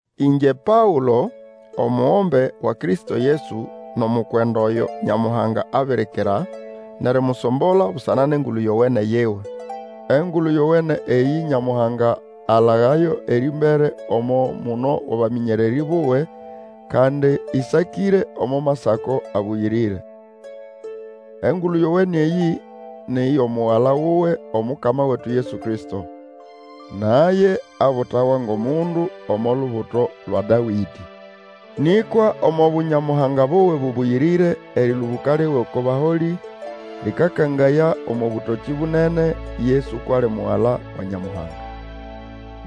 Ĩngye Paũlo, omugombe wa Kristo Yesu nʼomukwenda oyo Nyamuhanga abirikira nʼerimusombola busana nʼEngulu Yowene yiwe. Engulu Yowene eyĩ Nyamuhanga alagayo erĩmbere omo muno wʼabamĩnyererĩ buwe, kandi ĩsakĩre omo Masako abũyĩrĩre. Engulu Yowene eyĩ ni yʼomugala wuwe, Omukama wetu Yesu Kristo. Naye abutawa ngʼomundu omo lubuto lwa Dawĩdĩ. Nĩkwa omo Bunyamuhanga buwe bũbũyĩrĩre, erĩlũbũka liwe oko baholĩ lĩkakangaya omo bũtokĩ bunene, Yesu kwʼali Mugala wa Nyamuhanga.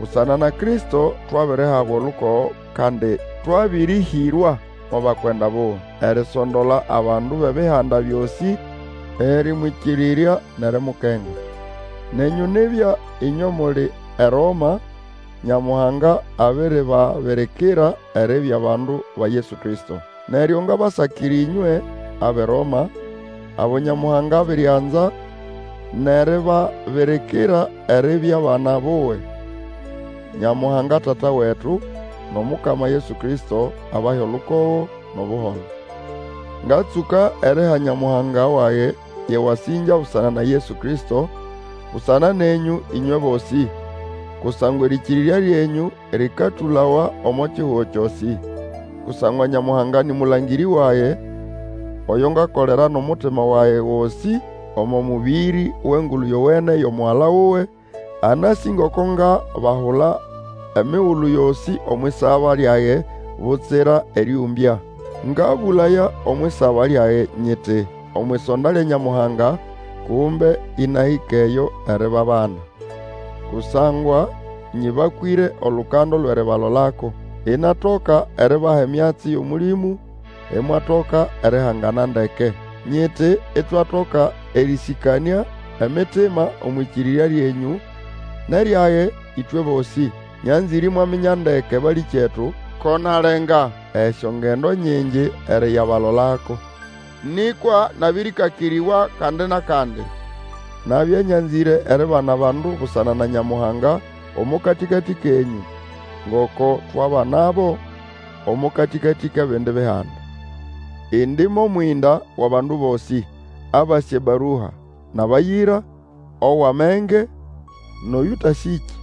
Busana na Kristo twabirihabwa olukogo, kandi twabĩrĩhĩrwa mo bakwenda buwe, erisondola abandu bʼebihanda byosĩ erĩmwĩkĩrĩrya nʼerimukenga. Nenyũ nibya ĩnywe muli eRoma, Nyamuhanga abiribabirikira eribya bandu ba Yesu Kristo. Neryo ngabasakira ĩnywe, abʼeRoma, abo Nyamuhanga abirianza nʼeribabirikira eribya bana buwe. Nyamuhanga Tata wetu, nʼomukama Yesu Kristo, abahe olukogo nʼobuholo. Ngatsũka eriha Nyamuhanga wage yʼewasĩngya busana na Yesu Kristo, busana nenyũ ĩnywe bosĩ. Kusangwa erĩkĩrĩrya lyenyũ lĩkatũlawa omo kihugo kyosĩ. Kusangwa Nyamuhanga nĩ mũlangĩrĩ wage, oyo ngakolera nʼomutima wage gosĩ omo mũbĩrĩ wʼEngulu Yowene yʼomugala wuwe, anasĩ ngoko ngabahula emigulu yosĩ omwʼisaba, lyage, butsira erĩũmbya. Ngabũlaya omwʼisaba lyage nyiti omwʼisonda lya Nyamuhanga, kumbe Ĩnahĩka eyo eribabana. Kusangwa nyĩbakwĩre olukando lwʼeribalolako, inatoka eribaha emyatsi yʼOmũlĩmũ, imwatoka erihangana ndeke. Nyiti itwatoka erĩsĩkanĩa emitima omwʼĩkĩrĩrya lyenyũ nʼeryage ĩtwe bosĩ. Nyanzĩre imwaminya ndeke, balĩkyetu, ko nalenga esyongendo nyingi eriyabalolako. Nĩkwa nabĩrĩkakĩrĩbwa kandi nʼakandi. Nabya nyanzĩre eribana abandu busana na Nyamuhanga omo katĩkatĩ kenyũ, ngoko twabanabo, omo katĩkatĩ kʼebindi bihanda. Indi mʼomwĩnda wʼabandu bosĩ, abasĩ ebarua nʼabayĩra, owʼamenge, nʼoyũtasĩkĩ.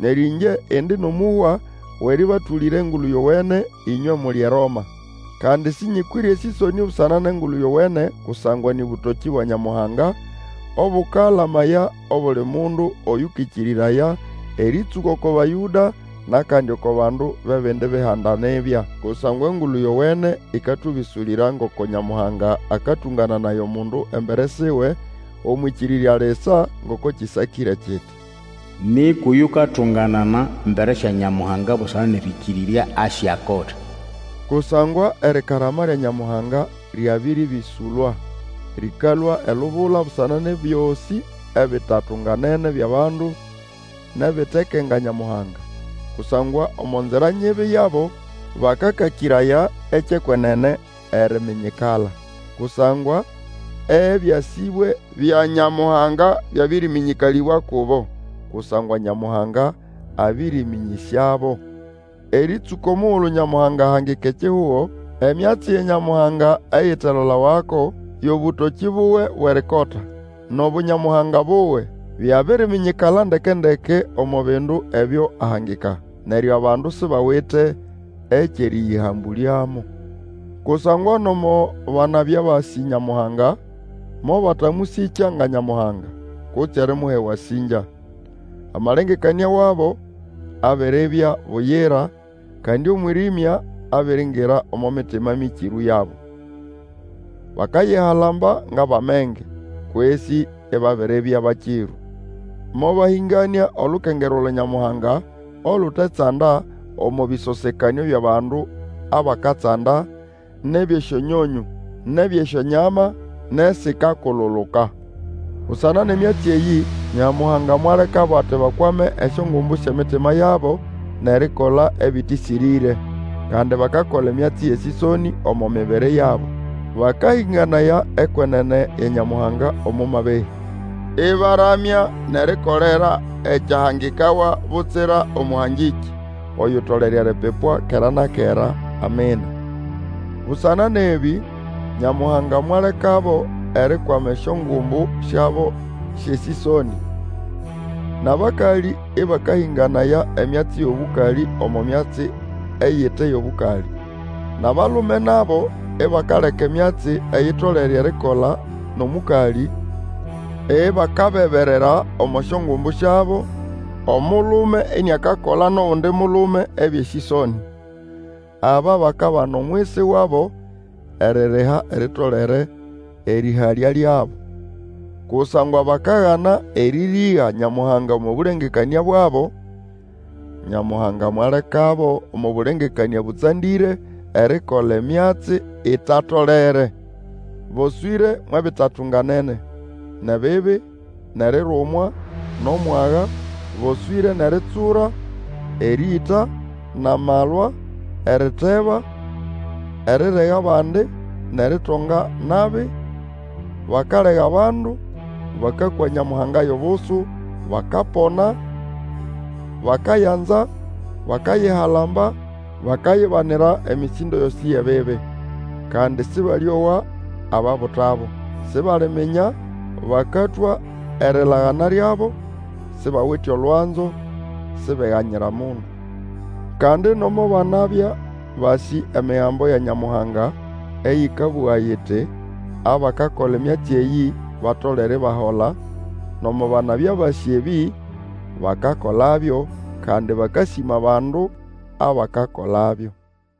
Neryo ĩngye indi nʼomũhwa wʼerĩbatũlĩra Engulu Yowene, ĩnywe muli eRoma. Kandi sĩnyĩkwĩre esĩsonĩ busana nʼEngulu Yowene, kusangwa nĩ bũtokĩ bwa Nyamuhanga, obũkalamaya obuli mundu Oyũkĩkĩrĩraya, erĩtsũka oko Bayũda, nʼakandi oko bandu bʼebindi bihanda nibya. Kusangwa Engulu Yowene ĩkatũbĩsũlĩra ngoko Nyamuhanga akatũngananaya omundu embere siwe, omwʼĩkĩrĩrya lisa, ngoko kĩsakĩre kiti, Nĩkwa oyukatunganana embere sya Nyamuhanga busana nʼerĩkĩrĩrya asyakota. Kusangwa erikarama lya Nyamuhanga lyabĩrĩbĩsũlwa, lĩkalũa elubula busana nʼebyosĩ ebitatunganene byʼabandu, nʼebitekenga Nyamuhanga. Kusangwa omo nzira nyibi yabo bakakakĩraya ekyʼekwenene eriminyikala. Kusangwa ebyasĩbwe bya Nyamuhanga byabĩrĩmĩnyĩkalĩbwa kubo, kusangwa Nyamuhanga abĩrĩmĩnyĩsyabo. Erĩtsũka omugulu Nyamuhanga ahangika ekihugo, emyatsi ya Nyamuhanga eyitalolawako, yʼobũtokĩ buwe bwʼerikota, nʼObunyamuhanga buwe, byabiriminyikala ndeke-ndeke omo bindu ebyo ahangika. Neryo abandu sibawite ekyʼerĩyĩhambũlyamo. Kusangwa nomo banabya basĩ Nyamuhanga, mobatamũsĩkya nga Nyamuhanga, kutse erimuha ewasĩngya. Amalengekanĩa wabo abiribya buyira, kandi omwĩrĩmya abiringira omo mitima mĩkĩrũ yabo. Bakayihalamba ngʼabʼamenge, kwesĩ ibabiribya bakĩrũ. Mobahĩnganĩa olukengerwa lwa Nyamuhanga olutetsanda, omo bĩsosekanĩo byʼabandu abakatsanda, nʼebyʼesyonyonyũ, nʼebyʼesyonyama, nʼesikakululuka. Busana nʼemyatsi eyĩ, Nyamuhanga mwalekabo ati bakwame esyongumbu syʼemitima yabo, nʼerikola ebĩtĩsĩrĩre. Kandi bakakola emyatsi yʼesĩsonĩ omo mibiri yabo. Bakahĩnganaya ekwenene ya Nyamuhanga omo mabehĩ, ĩbaramya nʼerikolera ekyahangikawa butsira Omũhangĩkĩ oyutolere eripipwa kera na kera! Amina. Busana nʼebĩ, Nyamuhanga mwalekabo erikwama esyongumbu syabo syʼesĩsonĩ, Nʼabakalĩ ĩbakahĩnganaya emyatsi yʼobũkalĩ omo myatsi eyite yʼobũkalĩ. Nʼabalume nabo ibakaleka emyatsi eyitolere erikola nʼomũkalĩ, ibakabeberera omo syongumbu syabo, omulume iniakakola nʼogundi mulume ebyʼesĩsonĩ. Aba bakabana omwisi wabo eririha eritolere erĩhalya lyabo. Kusangwa bakagana erĩrĩga Nyamuhanga omo bũlengekanĩa bwabo, Nyamuhanga mwalekabo omo bũlengekanĩa bũtsandĩre erikola emyatsi itatolere. Boswĩre mwʼebitatunganene, nʼebibi, nʼerirumwa, nʼomwaga, boswĩre nʼeritsura, erĩĩta, nʼamalwa, eriteba, erirega abandi, nʼeritonga nabi, bakalega abandu, bakakwa Nyamuhanga yʼobusu, bakapona, bakayanza, bakayihalamba, bakayibanira emĩsĩndo yosĩ yʼebibi. Kandi Sĩbalĩowa ababutabo. Sibaliminya, bakatwa erilagana lyabo, sibawite olwanzo, sibeganyira mundu. Kandi nomo banabya basĩ Emigambo ya Nyamuhanga eyĩkabũga iti, abakakola emyatsi eyĩ, batolere ibahola; nomo banabya basĩ ebĩ, bakakolabyo, kandi bakasĩma abandu abakakolabyo.